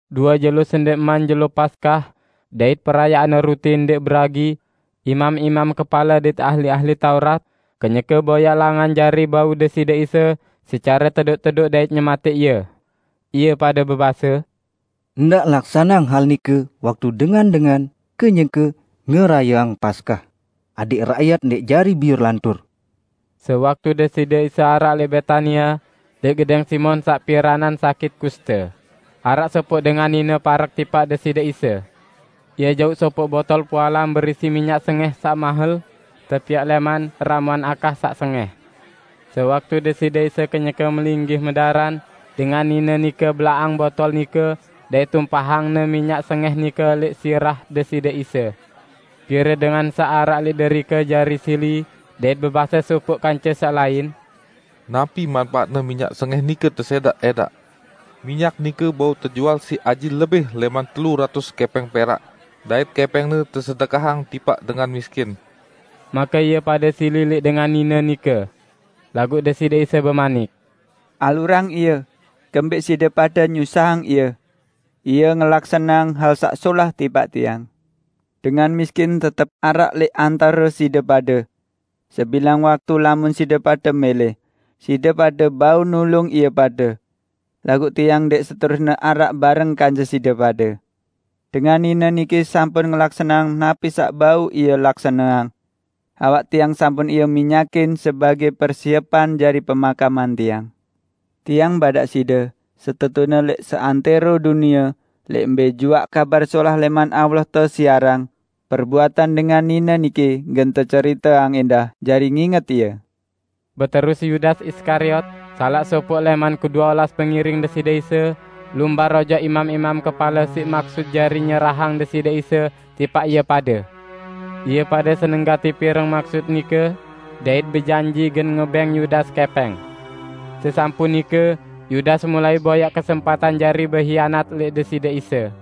Due jelo sendẽqman Jelo Paskah dait Perayaan Ruti Ndẽq Beragi. Imam-imam kepale dait ahli-ahli Taurat kenyeke boyaq langan jari bau Deside Isa secare tedoq-tedoq dait nyematẽq Ie. Ie pade bebase, "Ndaq laksaneang hal nike waktu dengan-dengan kenyeke ngerayeang Paskah, adẽq rakyat ndẽq jari biur lantur." Sewaktu Deside Isa araq lẽq Betania, lẽq gedẽng Simon saq piranan sakit kuste, araq sopoq dengan nine parek tipaq Deside Isa. Ie jauq sopoq botol pualam berisi minyak sengẽh saq mahel, tepiaq lẽman ramuan akah saq sengẽh. Sewaktu Deside Isa kenyeke melinggih medaran, dengan nine nike belaqang botol nike dait tumpahangne minyak sengẽh nike lẽq sirah Deside Isa. Pire dengan saq araq lẽq derike jari sili dait bebase sopoq kance saq lain, "Napi manpaatne minyak sengẽh nike tesẽdaq-ẽdaq? Minyak nike bau tejual siq aji lebih lẽman telu ratus kẽpẽng perak, dait kẽpẽngne tesedekahang tipaq dengan miskin!" Make ie pade sili lẽq dengan nine nike. Laguq Deside Isa bemanik, "Alurang ie! Kembẽq side pade nyusahang ie? Ie ngelaksaneang hal saq solah tipaq Tiang. Dengan miskin tetep araq lẽq antare side pade. Sebilang waktu lamun side pade mẽlẽ, side pade bau nulung ie pade. Laguq Tiang ndẽq seterusne araq bareng kance side pade. Dengan nine niki sampun ngelaksaneang napi saq bau ie laksaneang. Awak Tiang sampun ie minyakin sebagẽ persiepan jari pemakaman Tiang. Tiang badaq side: Setetune lẽq seantẽro dunie, lẽq mbẽ juaq Kabar Solah lẽman Allah tesiarang, perbuatan dengan nine niki gen teceriteang ẽndah jari nginget ie." Beterus Yudas Iskariot, salaq sopoq lẽman kedue olas pengiring Deside Isa, lumbar ojok imam-imam kepale siq maksut jari nyerahang Deside Isa tipaq ie pade. Ie pade seneng gati pireng maksut nike, dait bejanji gen ngebẽng Yudas kẽpẽng. Sesampun nike Yudas mulai boyaq kesempatan jari behianat lẽq Deside Isa.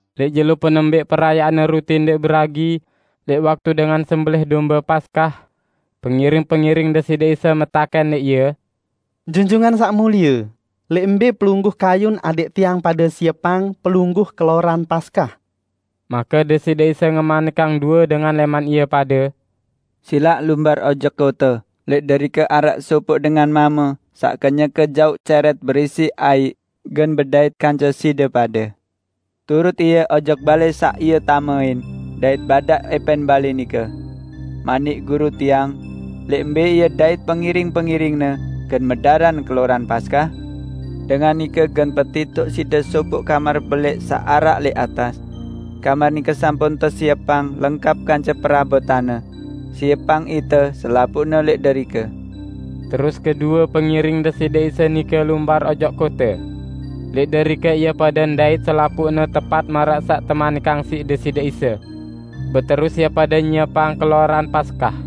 Lẽq jelo penembẽq Perayaan Ruti Ndẽq Beragi -- lẽq waktu dengan sembelẽh dombe Paskah -- pengiring-pengiring Deside Isa metakẽn lẽq Ie, "Junjungan Saq Mulie, lẽq mbẽ Pelungguh kayun adẽq tiang pade siepang Pelungguh keloran Paskah?" Make Deside Isa ngemanikang due dengan lẽman ie pade, "Silaq lumbar ojok kote, lẽq derike araq sopoq dengan mame saq kenyeke jauq cẽrẽt berisi aiq gen bedait kance side pade. Turut ie ojok balẽ saq ie tamein, dait badaq ẽpẽn balẽ nike, 'Manik Guru tiang, lẽq mbẽ Ie dait pengiring-pengiring-Ne gen medaran keloran Paskah?' Dengan nike gen petitoq side sopoq kamar belẽq saq araq lẽq atas. Kamar nike sampun tesiepang lengkap kance perabotanne. Siepang ite selapuqne lẽq derike." Terus kedue pengiring Deside Isa nike lumbar ojok kote. Lẽq derike ie pade ndait selapuqne tepat maraq saq temanikang siq Deside Isa. Beterus ie pade nyiepang keloran Paskah.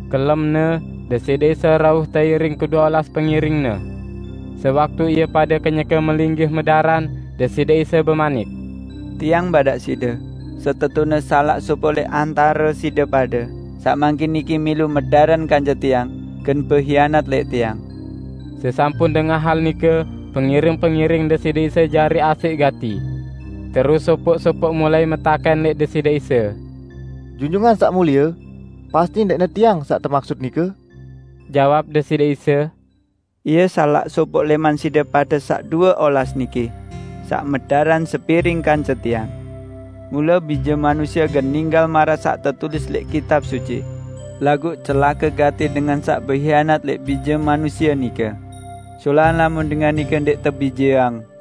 Kelemne, Deside Isa rauh teiring kedue olas pengiring-Ne. Sewaktu ie pade kenyeke melinggih medaran, Deside Isa bemanik, "Tiang badaq side: Setetune salaq sopoq lẽq antare side pade, saq mangkin niki milu medaran kance Tiang, gen behianat lẽq Tiang." Sesampun dengah hal nike pengiring-pengiring Deside Isa jari asẽq gati. Terus sopoq-sopoq mulai metakẽn lẽq Deside Isa, "Junjungan Saq Mulie, pasti ndẽqne tiang saq temaksut nike?" Jawab Deside Isa, "Ie salaq sopoq lẽman side pade saq due olas niki, saq medaran sepiring kance Tiang. Mule Bije Manusie gen ninggal maraq saq tetulis lẽq Kitab Suci. Laguq celake gati dengan saq behianat lẽq Bije Manusie nike! Solahan lamun dengan nike ndẽq tebijeang!"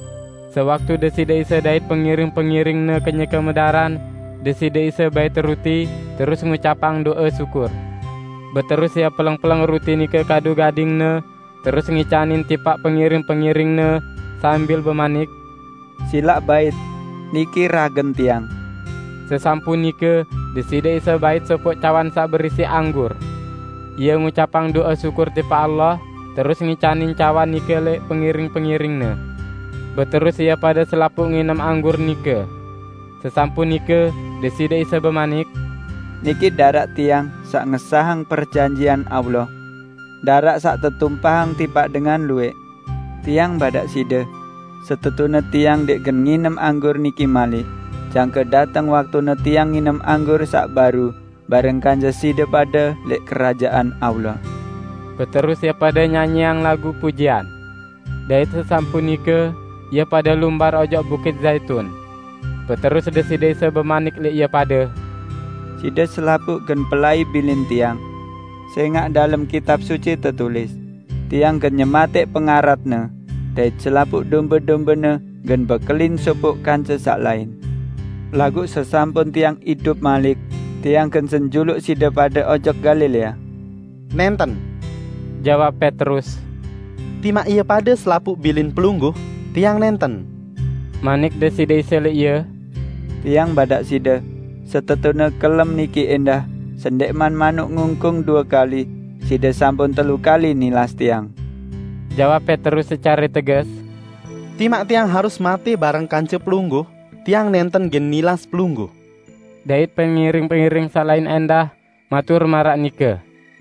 Sewaktu Deside Isa dait pengiring-pengiring-Ne kenyeke medaran, Deside Isa bait ruti, terus ngucapang do'e syukur. Beterus Ie peleng-peleng ruti nike kadu gading-Ne, terus ngicanin tipaq pengiring-pengiring-Ne, sambil bemanik, "Silaq bait, niki ragen Tiang." Sesampun nike Deside Isa bait sopoq cawan saq berisi anggur. Ie ngucapang do'e syukur tipaq Allah, terus ngicanin cawan nike lẽq pengiring-pengiring-Ne. Beterus ie pade selapuq nginem anggur nike. Sesampun nike, Deside Isa bemanik, "Niki daraq Tiang saq ngesahang perjanjian Allah, daraq saq tetumpahang tipaq dengan luwẽq. Tiang badaq side, setetune Tiang ndẽq gen nginem anggur niki malik, jangke dateng waktune Tiang nginem anggur saq baru bareng kance side pade lẽq Kerajaan Allah." Beterus ie pade nyanyiang lagu pujian. Dait sesampun nike ie pade lumbar ojok Bukit Zaitun. Beterus Deside Isa bemanik lẽq ie pade, "Side selapuq gen pelai bilin Tiang. Sẽngaq dalem Kitab Suci tetulis, 'Tiang gen nyematẽq pengaratne, dait selapuq dombe-dombene gen bekelin sopoq kance saq lain.' Laguq sesampun Tiang idup malik, Tiang gen senjuluq side pade ojok Galilea." "Nẽnten," jawab Petrus, "timaq ie pade selapuq bilin Pelungguh, tiang nẽnten." Manik Deside Isa lẽq ie, "Tiang badaq side, setetune kelem niki ẽndah, sendẽqman manuk ngungkung due kali, side sampun telu kali nilas Tiang." Jawab Petrus secare teges, "Timaq tiang harus matẽ bareng kance Pelungguh, tiang nẽnten gen nilas Pelungguh!" Dait pengiring-pengiring saq lain ẽndah matur maraq nike.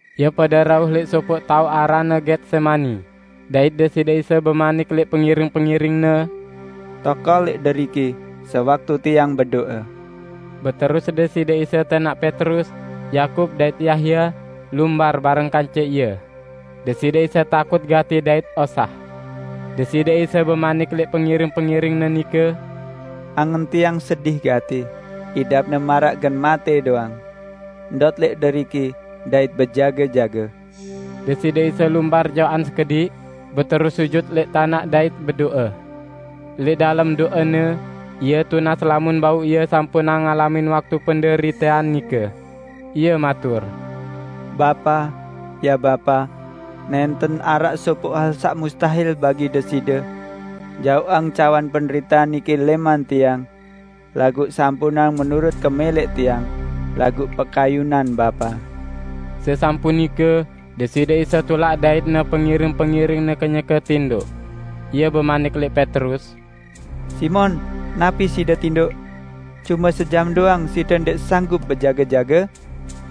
Ie pade rauh lẽq sopoq taoq aranne Getsemani, dait Deside Isa bemanik lẽq pengiring-pengiring-Ne, "Tokol lẽq deriki, sewaktu Tiang bedo'e." Beterus Deside Isa tẽnaq Petrus, Yakub dait Yahya lumbar bareng kance Ie. Deside Isa takut gati dait osah. Deside Isa bemanik lẽq pengiring-pengiring-Ne nike, "Angen Tiang sedih gati, idapne maraq gen matẽ doang. Ndot lẽq deriki dait bejage-jage!" Deside Isa lumbar jaoqan sekediq, beterus sujut lẽq tanaq dait bedo'e. Lẽq dalem do'e-Ne, Ie tunas lamun bau Ie sampunang ngalamin waktu penderitean nike. Ie matur, "Bapa, ya Bapa, nẽnten araq sopoq hal saq mustahil bagi Deside. Jaoqang cawan penderitean niki lẽman Tiang. Laguq sampunang menurut kemẽlẽq Tiang, laguq pekayunan Bapa." Sesampun nike, Deside Isa tulak dait-Ne pengiring-pengiring-Ne kenyeke tindoq. Ie bemanik lẽq Petrus, "Simon, napi side tindoq? Cume sejam doang, side ndẽq sanggup bejage-jage?"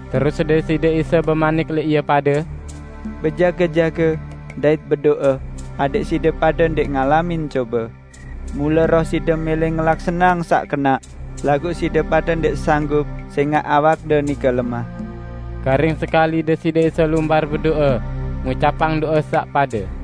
Terus Deside Isa bemanik lẽq ie pade, "Bejage-jage, dait bedo'e, adẽq side pade ndẽq ngalamin cobe. Mule roh side mẽlẽ ngelaksaneang saq kenaq, laguq side pade ndẽq sanggup sẽngaq awakde nike lemah." Karing sekali Deside Isa lumbar bedo'e, ngucapang do'e saq pade.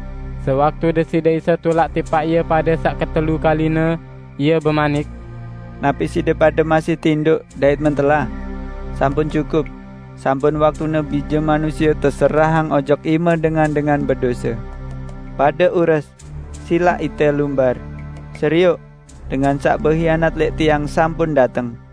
Sewaktu Deside Isa tulak tipaq ie pade saq ketelu kaline, Ie bemanik, "Napi side pade masih tindoq dait mentelah? Sampun cukup! Sampun waktune Bije Manusie teserahang ojok ime dengan-dengan bedose. Pade ures! Silaq ite lumbar. Serioq! Dengan saq behianat lẽq Tiang sampun dateng!"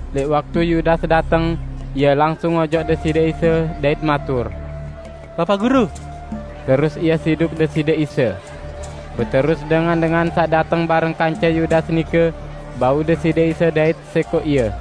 Lẽq waktu Yudas dateng, ie langsung ojok Deside Isa, dait matur, "Bapaq Guru!" terus ie siduk Deside Isa. Beterus dengan-dengan saq dateng bareng kance Yudas nike bau Deside Isa dait sẽkoq Ie.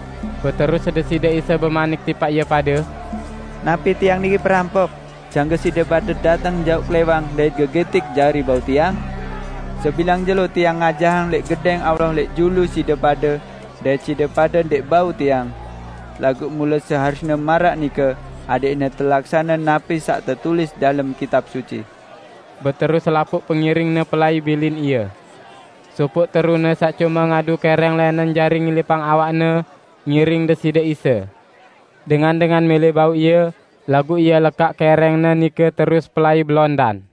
Beterus Deside Isa bemanik tipaq ie pade, "Napi Tiang niki perampok, jangke side pade dateng jauq klẽwang dait gegitik jari bau Tiang? Sebilang jelo Tiang ngajahang lẽq Gedẽng Allah lẽq julu side pade dait side pade ndẽq bau Tiang. Laguq mule seharusne maraq nike adẽqne telaksane napi saq tetulis dalem Kitab Suci." Beterus selapuq pengiring-Ne pelai bilin Ie. Sopoq terune saq cume ngadu kẽrẽng lẽnen jari ngilipang awakne, ngiring Deside Isa. Dengan-dengan mẽlẽ bau ie, laguq ie lekaq kẽrẽngne nike terus pelai belondan.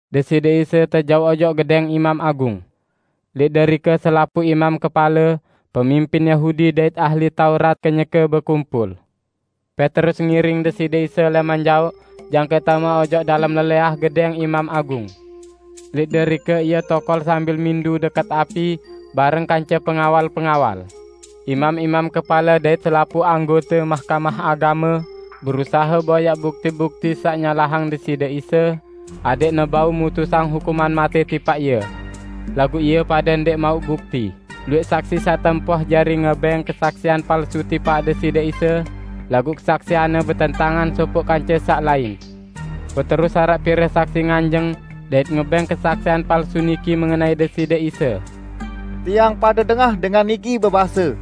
Deside Isa tejauq ojok gedẽng Imam Agung. Lẽq derike selapuq imam kepale, pemimpin Yahudi dait ahli Taurat kenyeke bekumpul. Petrus ngiring Deside Isa lẽman jaoq jangke tame ojok dalem lelẽah gedẽng Imam Agung. Lẽq derike ie tokol sambil mindu dẽkẽt api bareng kance pengawal-pengawal. Imam-imam kepale dait selapuq Mahkamah Agame berusahe boyaq bukti-bukti saq nyalahang Deside Isa adẽqne bau mutusang hukuman matẽ tipaq Ie. Laguq ie pade ndẽq mauq bukti. Luwẽq saksi saq tempoh jari ngebẽng kesaksian palsu tipaq Deside Isa, laguq kesaksianne betentangan sopoq kance saq lain. Beterus araq pire saksi nganjeng dait ngebẽng kesaksian palsu niki mengenai Deside Isa, "Tiang pade dengah dengan niki bebase,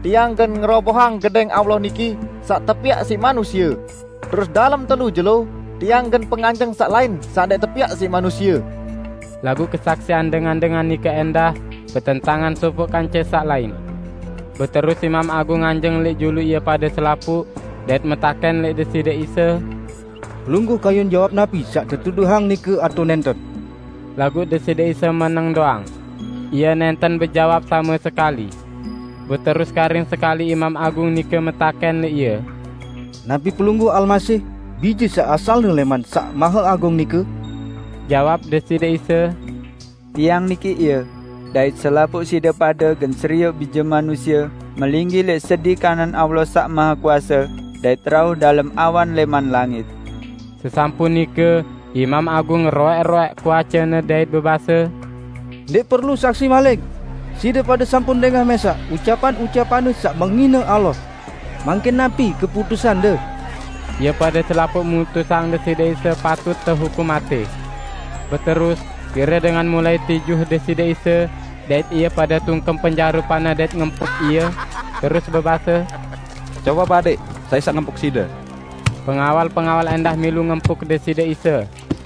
'Tiang gen ngerobohang Gedẽng Allah niki saq tepiaq siq manusie, terus dalem telu jelo, Tiang gen penganjeng saq lain saq ndẽq tepiaq siq manusie.' " Laguq kesaksian dengan-dengan nike ẽndah betentangan sopoq kance saq lain. Beterus Imam Agung nganjeng lẽq julu ie pade selapuq dait metakẽn lẽq Deside Isa, "Pelungguh kayun jawab napi saq tetuduhang nike atao nẽnten?" Laguq Deside Isa meneng doang. Ie nẽnten bejawab same sekali. Beterus karing sekali Imam Agung nike metakẽn lẽq Ie, "Napi Pelungguh Almasih, Bije saq asalne lẽman Saq Maheagung nike?" Jawab Deside Isa, "Tiang niki Ie, dait selapuq side pade gen serioq Bije Manusie melinggih lẽq sedi kanan Allah Saq Mahekuase dait rauh dalem awan lẽman langit!" Sesampun nike Imam Agung ngeroẽk-roẽk kuacene, dait bebase, "Ndẽq perlu saksi malik! Side pade sampun dengah mẽsaq ucapan-ucapan-Ne saq menghine Allah. Mangkin napi keputusande?" Ie pade selapuq mutusang Deside Isa patut tehukum matẽ. Beterus pire dengan mulai tijuh Deside Isa, dait ie pade tungkem penjarupan-Ne dait ngempuk Ie, terus bebase, "Cobaq badẽq, sai saq ngempuk Side?" Pengawal-pengawal ẽndah milu ngempuk Deside Isa.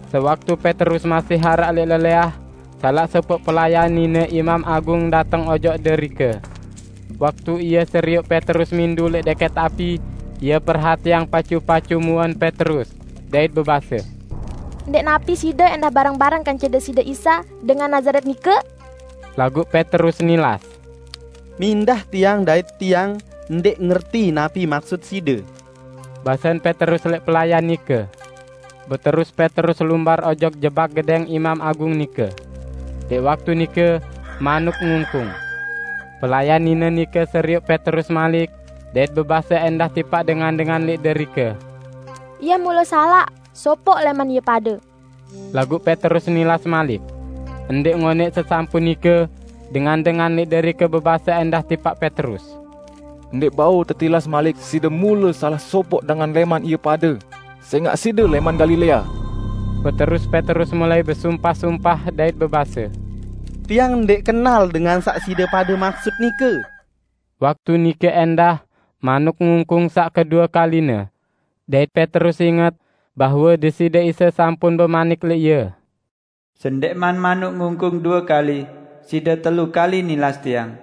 Sewaktu Petrus masih araq lẽq lelẽah, salaq sopoq pelayan nine Imam Agung dateng ojok derike. Waktu ie serioq Petrus mindu lẽq dẽkẽt api, ie perhatiang pacu-pacu muen Petrus, dait bebase, "Ndẽq napi side ẽndah bareng-bareng kance Deside Isa dengan Nazaret nike?" Laguq Petrus nilas. "Mindah tiang dait tiang ndẽq ngerti napi maksut side," basen Petrus lẽq pelayan nike. Beterus Petrus lumbar ojok jebak gedẽng imam agung nike. [Lẽq waktu nike, manuk ngungkung.] Pelayan nine nike serioq Petrus malik, dait bebase ẽndah tipaq dengan-dengan lẽq derike, "Ie mule salaq sopoq lẽman ie pade!" Laguq Petrus nilas malik. Ndẽq ngonẽq sesampun nike, dengan-dengan lẽq derike bebase ẽndah tipaq Petrus, "Ndẽq bau tetilas malik side mule salaq sopoq dengan lẽman ie pade, sẽngaq side lẽman Galilea!" Beterus Petrus mulai besumpah-sumpah, dait bebase, "Tiang ndẽq kenal dengan saq side pade maksut nike!" Waktu nike ẽndah manuk ngungkung saq kedue kaline. Dait Petrus inget bahwe Deside Isa sampun bemanik lẽq ie, "Sendẽqman manuk ngungkung due kali, side telu kali nilas Tiang."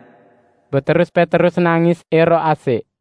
Beterus Petrus nangis ẽroq asẽq.